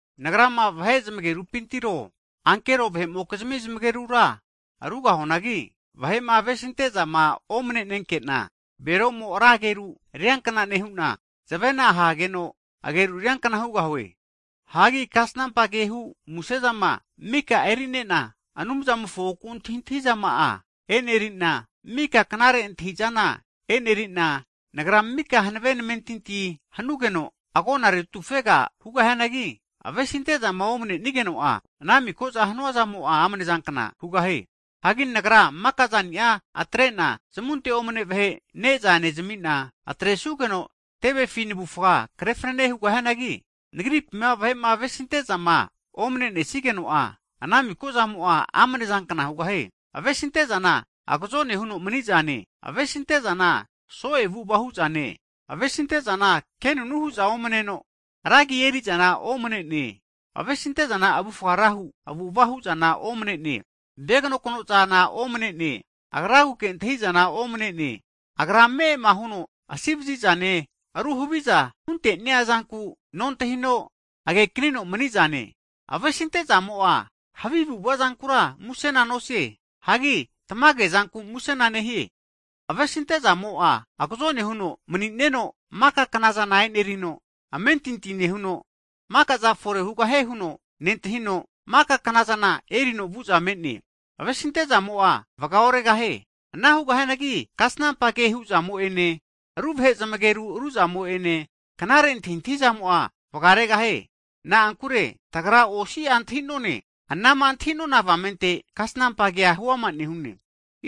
Nagrama vahe zmagerupintiro, ankero vahe'mokizimi zmagerura rugahuanagi, vahe'ma avesinte'zama omne'nenke'na, bero'mo ra ageru riankna nehu'na, zavena ahageno ageru riankna hugahue. Hagi kasnampa ke hu muse'zane mika e'neri'na, Anumzamofo oku antahizama'a e'neri'na, mika knare antahi'zana e'neri'na, nagra mika hanave namentintia hanugeno agona retufega hugahianagi, avesinte'zama omne'nenigeno'a ana miko'za hanua zamo'a amnezankna hugahie. Hagi nagrama maka'zani'a atre'na, zamunte omne vahe ne'za nezami'na, atresugeno tevefi navufa krefnane hugahianagi, nagripima vahe'ma avesinte'zama omne'nesigeno'a, ana miko'zamo'a amnezankna hugahie. Avesinte'zana, agazone huno mni'zane, avesinte'zana so'e avu'ava hu'zane, avesinte'zana kenunu hu'za omneno, ra agi eri'zana omne'ne, avesinte'zana avufga ra hu avu'ava hu'zana omne'ne, veganokno'zana omne'ne, agraguke antahi'zana omne'ne, agra ame'ama huno asi ovazi'zane, rumo haviza hunte'nea zanku nontahino agekanino mani'zane. Avesinte'zamo'a havi avu'ava'zankura musena nosie. Hagi tamagezanku musena nehie. Avesinte'zamo'a, agazone huno mni'neno maka knazana e'nerino, amentinti nehuno, maka'za fore hugahie huno nentahino, maka knazana erino vu'za me'ne. Avesinte'zamo'a vgaoregahie. Ana hu'neanagi kasnampa ke hu'zamo ene, ru vahe zmageru ru'zamo ene, knare antahintahizamo'a vgaregahie. Na'ankure tagra osi'a antahi'none. Anama antahi'nona avamente kasnampa kea huama nehune.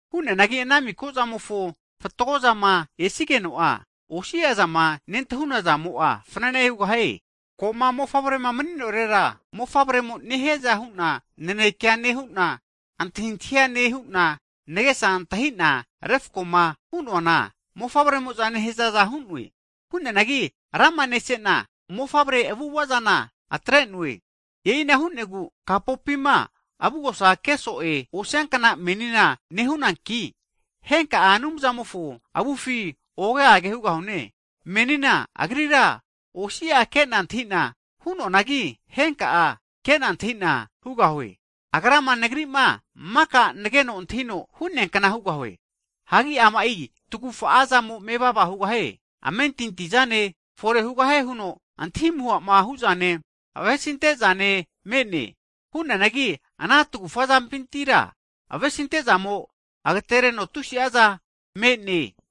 Hu'neanagi ana miko'zamofo fatgozama esigeno'a, osi'a zama nentahuna zamo'a fnane hugahie. Ko'ma mofavre'ma mni'norera, mofavremo nehiaza hu'na nanekea nehu'na, antahintahia nehu'na, nagesa antahi'na refko'ma hu'noana mofavremo'za nehazaza hu'noe. Hu'neanagi rama nese'na, mofavre avu'ava'zana atre'noe. E'ina hu'negu kapopima avugosa ke so'e osiankna menina nehunanki, henka'a Anumzamofo avufi oge age hugahune. Menina Agrira osi'a ke'na antahi'na hu'noanagi, henka'a kena antahi'na hugahue. Agrama nagri'ma maka nageno antahini hu'neankna hugahue. Hagi ama'i tagufa'azamo mevava hugahie, amentintihu zane, fore hugahie huno antahi amuha hu'zane, avesinte zane me'ne. Hu'neanagi ana tagufa zampintira, avesinte'zamo agatereno tusi'a zana me'ne.